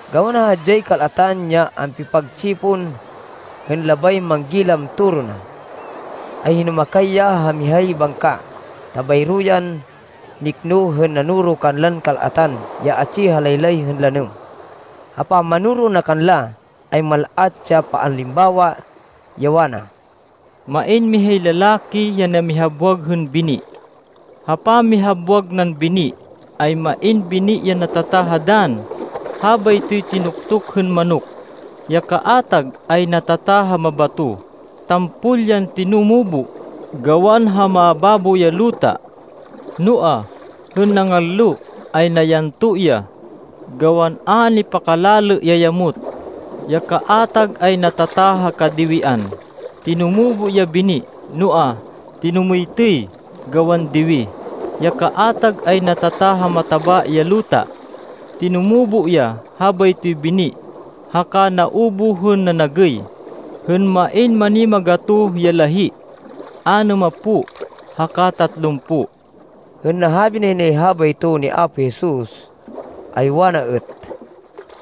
Gawan ha hadyay kal-atan ya ampipagtsipon hên labay manggilam toro na, ay hinumakay ya ha mihay bangka, ta bayro yan nikno hên nanoro kanlan kal-atan ya atsi ha laylay hên lanêm. Ha pamanoro na kanla, ay mal-at ya paalimbawa, ya wana, “Main mihay lalaki ya namihabwag hên bini. Ha pamihabwag nan bini, ay main bini ya natata ha dann. Habaytoy tinuktuk hên manok. Ya kaatag ay natata ha mabato. Tampol yan tinumubo, gawan ha mababo ya luta. Noa, hên nangallo, ay nayanto ya, gawan a nipakalalê ya yamot. Ya kaatag ay natata ha kadiwian. Tinumubo ya bini, noa, tinumêytêy, gawan diwi. Ya kaatag ay natata ha mataba ya luta. Tinumubo ya habaytoy bini haka naubuh hên nanagêy, hên main manimagatoh ya lahí, anêmapo, haka tatlumpo.” Hên nahabi nay habayto ni Apo Jesus, ay wana êt,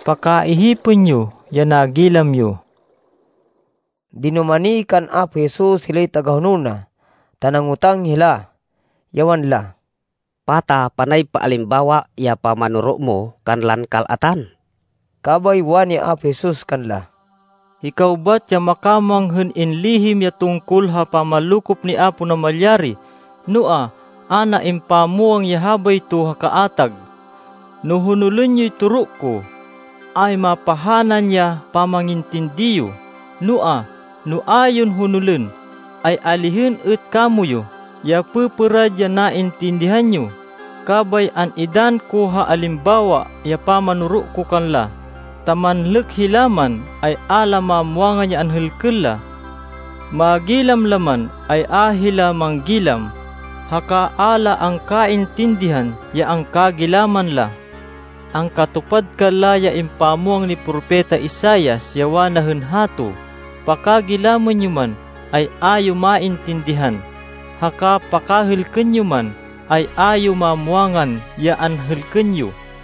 “Pakaihipên yo ya nagilam yo!” Dinumani kan Apo Jesus hilay tagahonol na ta nangotang hila, ya wanla, “Pata panay paalimbawa ya pamanoro mo kanlan kal-atan?” Kabay wani Apo Jesus kanla, “Hikaw bat ya makamwang hên inlihim ya tungkol ha pamanlokop ni Apo Namalyari, noa, a na impamwang ya habayto ha kaatag. No honolên yoy toro ko, ay mapahanan ya pamangintindi yo, noa, no a yon honolên, ay alihên êt kamoyu ya pêpêrad ya naintindihan yo. Kabay an-idann ko ha alimbawa ya pamanoro ko kanla, ta ‘Manlêk hila man, ay a la mamwangan ya anhêlkên la. Magilam la man, ay a hila manggilam, haka a la angkaintindihan ya angkagilaman la.’ Angkatupad kanla ya impamwang ni Propeta Isaias, ya wana hên hato, ‘Pakagilamên yo man, ay a yo maintindihan, haka pakahêlkên yo man, ay a yo mamwangan ya anhêlkên yo.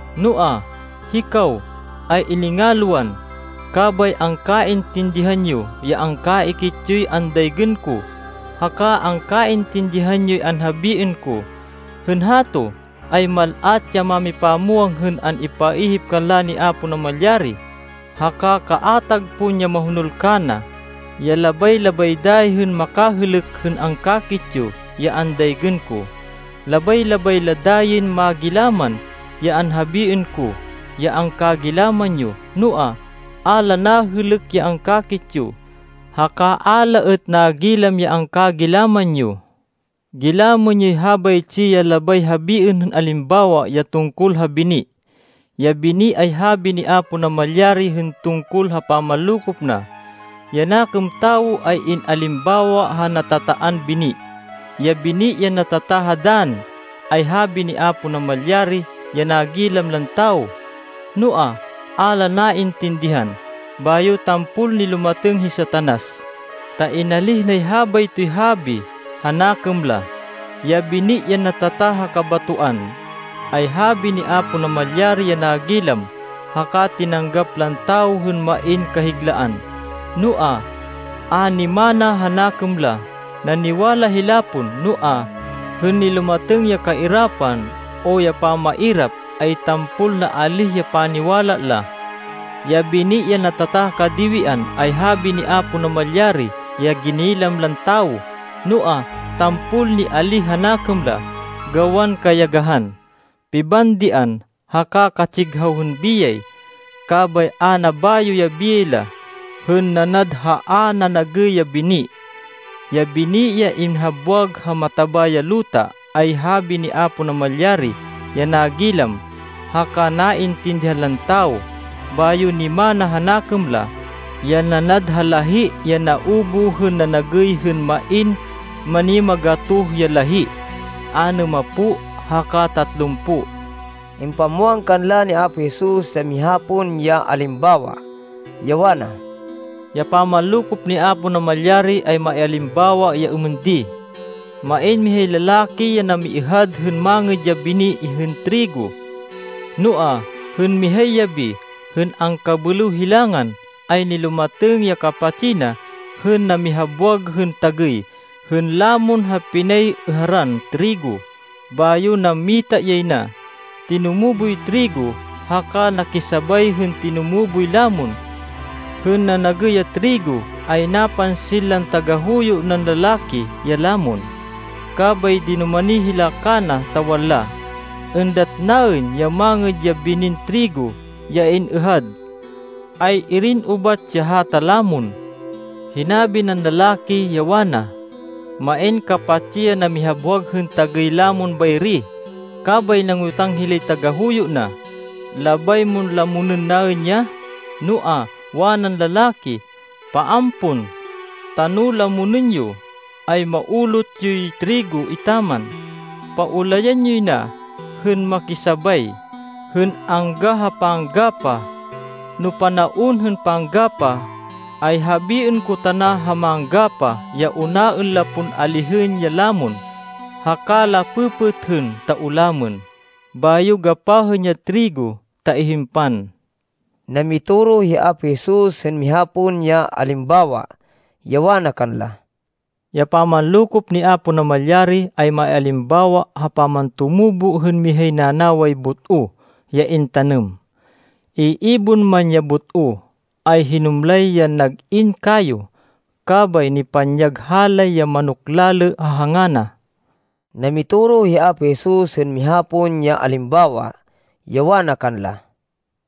Noa, hikaw, ay iningalwan, kabay angkaintindihan yo ya angkakit yoy andaygên ko, haka angkaintindihan yoy anhabiên ko. Hên hato, ay mal-at ya mámipamwang hên an-ipaihip kanla ni Apo Namalyari, haka kaatag pon ya mahonol kana, ya labay-labay dayi hên makahêlêk hên angkakit yo ya andaygên ko. Labay-labay la dayin magilaman ya anhabiên ko ya angkagilaman yo. Noa, a la nahêlêk ya angkakit yo, haka a la êt nagilam ya angkagilaman yo.” “Gilamên yoy habaytsi ya labay habiên hên alimbawa ya tungkol ha bini. Ya bini ay habi ni Apo Namalyari hên tungkol ha pamanlokop na. Ya nakêm tawo ay in-alimbawa ha natataan bini. Ya bini ya natata ha dann ay habi ni Apo Namalyari ya nagilam lan tawo, noa, a la naintindihan, bayo tampol nilumatêng hi Satanas, ta inalíh nay habaytoy habi ha nakêm la. Ya bini ya natata ha kabatoan, ay habi ni Apo Namalyari ya nagilam haka tinanggap lan tawo hên main kahiglaan, noa, a nimana ha nakêm la. Naniwala hila pon, noa, hên nilumatêng ya kairapan o ya pamairap, ay tampol naalíh ya paniwala la. Ya bini ya natata ha kadiwian ay habi ni Apo Namalyari ya ginilam lan tawo, noa, tampol nialíh ha nakêm la, gawan kayagahan, pibandian, haka katsighaw hên biyay. Kabay a nabayo ya biyay la, hên nanad ha a nanagêy ya bini. Ya bini ya inhabwag ha mataba ya luta ay habi ni Apo Namalyari ya nagilam haka naintindihan lan tawo, bayo nimana ha nakêm la, ya nanad ha lahí ya naubuh hên nanagêy hên main manimagatoh ya lahí, anêmapo, haka tatlumpo.” Impamwang kanla ni Apo Jesus ya miha pon ya alimbawa, ya wana, “Ya pamanlokop ni Apo Namalyari ay maialimbawa ya êmên di: Main mihay lalaki ya namiêhad hên mangêd ya bini hên trigo. Noa, hên mihay yabi, hên angkabêlêw hilangan, ay nilumatêng ya kapatsi na hên namihabwag hên tagêy hên lamon ha pinay-êharan trigo, bayo nammita yay na. Tinumuboy trigo haka nakisabay hên tinumuboy lamon. Hên nanagêy ya trigo, ay napansin lan tagahuyo nan lalaki ya lamon. Kabay dinumani hila kana, ta wanla, ‘Êndat naên ya mangêd ya binin trigo ya in-êhad. Ay-irin ubat ya hata lamon?’ Hinabi nan lalaki, ya wana, ‘Main kapatsi ya namihabwag hên tagêy hên lamon bayri.’ Kabay nangotang hilay tagahuyo na, ‘Labay mon lamonên naên ya?’ Noa, wanan lalaki, ‘Paan pon. Ta no lamonên yo, ay maulot yoy trigo etaman. Paulayan yoy na hên makisabay, hên angga ha panggapah. No panaon hên panggapah, ay habiên ko tana ha manggapah ya unaên la pon alihên ya lamon, haka la pêpêthên ta ulamên. Bayo gapahên ya trigo ta ihimpan.’” Namitoro hi Apo Jesus hên miha pon ya alimbawa, ya wana kanla, “Ya pamanlokop ni Apo Namalyari ay maialimbawa ha pamantumubo hên mihay nanaway but-o ya intanêm. Iibon man ya but-o, ay hinumlay yan nag-in kayo, kabay nipanyag halay ya manok-lalê ha hanga na.” Namitoro hi Apo Jesus hên miha pon ya alimbawa, ya wana kanla,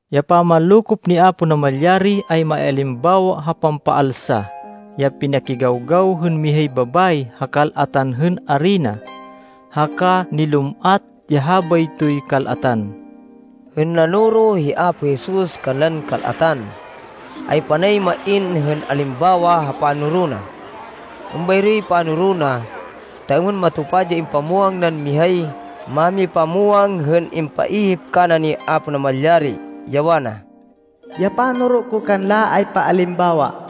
“Ya pamanlokop ni Apo Namalyari ay maialimbawa ha pampaalsa ya pinakigawgaw hên mihay babayi ha kal-atan hên arina, haka nilum-at ya habaytoy kal-atan.” Hên nanoro hi Apo Jesus kanlan kal-atan, ay panay main hên alimbawa ha panoro na. Êmbayroy panoro na ta êmên matupad ya impamwang nan mihay mámipamwang hên impaihip kana ni Apo Namalyari, ya wana, “Ya panoro ko kanla ay paalimbawa.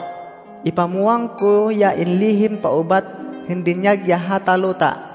Ipamwang ko ya inlihim paubat hên dinyag ya hata luta.”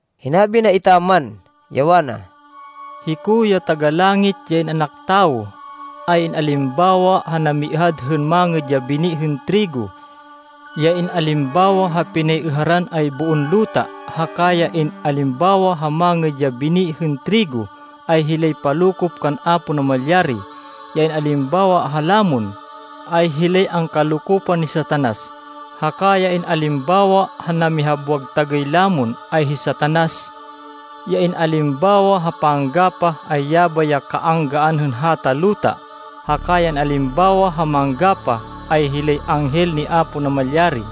Hinabi na etaman, ya wana, “Hiko, ya Taga-Langit, ya In-anak Tawo, ay in-alimbawa ha namiêhad hên mangêd ya bini hên trigo. Ya in-alimbawa ha pinay-êharan ay boon luta, haka ya in-alimbawa ha mangêd ya bini hên trigo, ay hilay palokop kan Apo Namalyari. Ya in-alimbawa ha lamon, ay hilay angkalokopan ni Satanas, haka ya in-alimbawa ha namihabwag tagêy lamon, ay hi Satanas. Ya in-alimbawa ha panggapah, ay yabay ya kaanggaan hên hata luta, haka ya in-alimbawa ha manggapah, ay hilay anghel ni Apo Namalyari.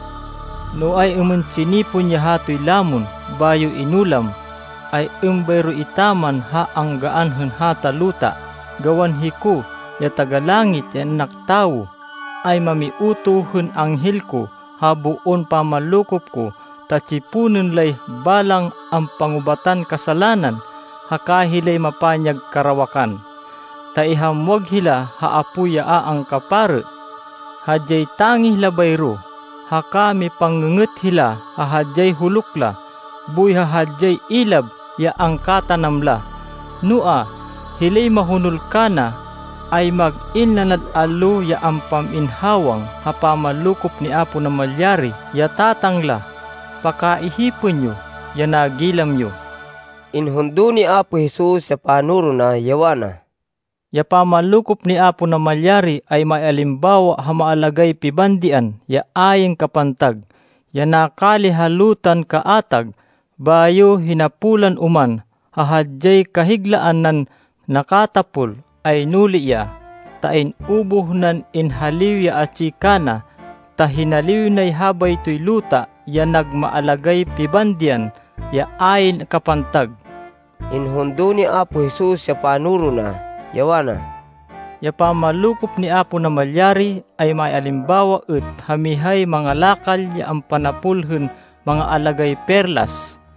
No ay-êmên tsinipon ya hatoy lamon, bayo inulam, ay êmbayro etaman ha anggaan hên hata luta. Gawan hiko, ya Taga-Langit, ya In-anak Tawo, ay mamiutoh hên anghel ko ha boon pamanlokop ko, ta tsiponên lay balang ampangubatan kasalanan, haka hilay mapanyag karawakan, ta ihamwag hila ha apoy ya a angkaparê. Hadyay tangih la bayro, haka mipang-ngê-ngêt hila ha hadyay huluk la, boy ha hadyay ilab ya angkatanam la. Noa, hilay mahonol kana, ay mag-in nanad allo ya ampam-in hawang ha pamanlokop ni Apo Namalyari ya Tatang la. Pakaihipên yo ya nagilam yo.” Inhundo ni Apo Jesus ya panoro na, ya wana, “Ya pamanlokop ni Apo Namalyari ay maialimbawa ha maalagáy pibandian ya ayn kapantag, ya nakali ha lutan kaatag, bayo hinapolan oman. Ha hadyay kahiglaan nan nakatapol, ay nuli ya, ta in-ubuh nan inhaliw ya atsi kana, ta hinaliw nay habaytoy luta ya nag maalagáy pibandian ya ayn kapantag.” Inhundo ni Apo Jesus ya panoro na, ya wana, “Ya pamanlokop ni Apo Namalyari ay maialimbawa êt ha mihay mangalakal ya ampanapol hên maalagáy perlas.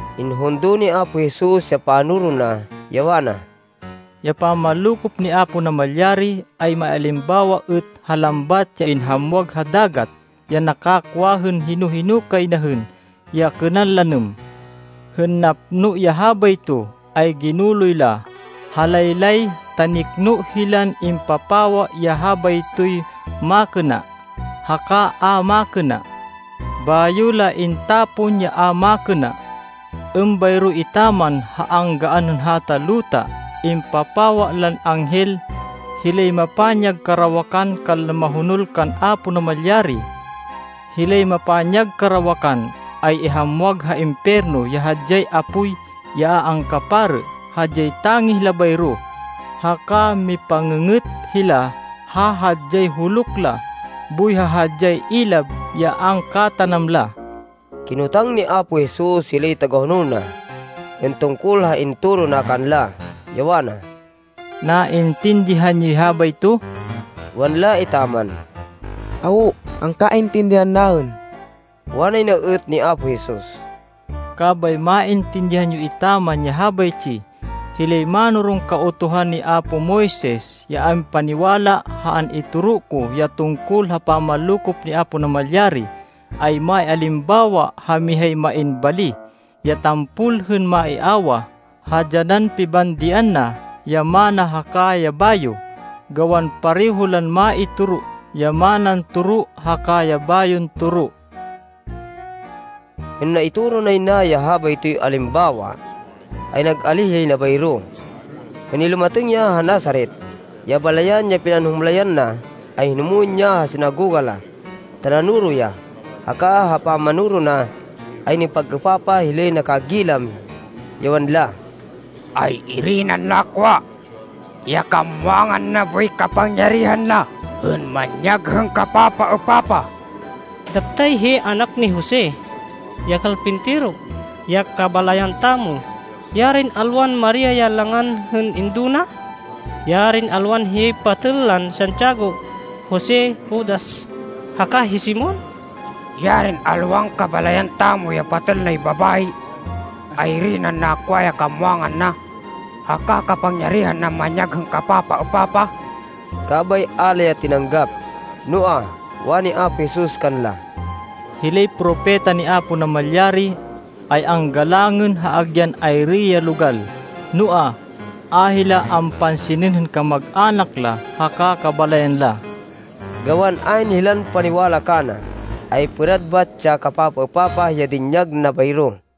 Inhundo ni Apo Jesus ya panoro na, ya wana, “Ya pamanlokop ni Apo Namalyari ay maialimbawa êt ha lambat ya inhamwag ha dagat, ya nakakwa hên hino-hino kay na hên ya kênan lanêm. Hên napno ya habayto, ay ginuloy la ha laylay, ta nikno hilan impapawa ya habaytoy makêna haka a makêna. Bayo la intapon ya a makêna. Êmbayro etaman ha anggaan hên hata luta. Ipapawa lan anghel, hilay mapanyag karawakan kanlan mahonol kan Apo Namalyari. Hilay mapanyag karawakan, ay ihamwag ha impiyerno ya hadyay apoy ya a angkaparê. Hadyay tangih la bayro, haka mipang-ngê-ngêt hila ha hadyay huluk la, boy ha hadyay ilab ya angkatanam la.” Kinotang ni Apo Jesus hilay tagahonol na hên tungkol ha intoro na kanla, ya wana, “Naintindihan yoy habayto?” Wanla etaman, “Awo. Angkaintindihan naên.” Wanay na êt ni Apo Jesus, “Kabay maintindihan yo etaman ya habaytsi: hilay mánoron Kautuhan ni apo Moises ya ampaniwala ha an-itoro ko ya tungkol ha pamanlokop ni Apo Namalyari, ay maialimbawa ha mihay main bali, ya tampol hên maiawah ha dyanan pibandian na ya mana haka ya bayo. Gawan pareho lan maitoro ya manan toro haka ya bayon toro.” Hên naitoro nay na ya habaytoy alimbawa, ay nag-alíh yay na bayro. Hên nilumatêng ya ha Nazaret, ya balayan ya pinanhumlayan na, ay hinumwên ya ha sinagoga la, ta nanoro ya. Haka ha pamanoro na, ay nipag-êpapah hilay nakagilam, ya wanla, “Ay-iri nan nakwa ya kamwangan na boy ya kapangyarihan na hên manyag hên kapapaêpapah?” “Daptay hiyay anak ni Jose, ya kalpintero, ya kabalayan tamo. Yarin alwan Maria ya langan hên indo na! Yarin alwan hiyay patêl lan Santiago, Jose, Judas, haka hi Simon! Yarin alwan kabalayan tamo ya patêl nay babayi! Ay-iri nan nakwa ya kamwangan na, haka kapangyarihan nan manyag hên kapapaêpapah?” Kabay a la ya tinanggap. Noa, wani Apo Jesus kanla, “Hilay propeta ni Apo Namalyari, ay anggalangên ha agyan ayri ya logal, noa, a hila ampansinên hên kamag-anak la haka kabalayan la.” Gawan ayn hilan paniwala kana, ay pêrad bat ya kapapaêpapah ya dinyag na bayro.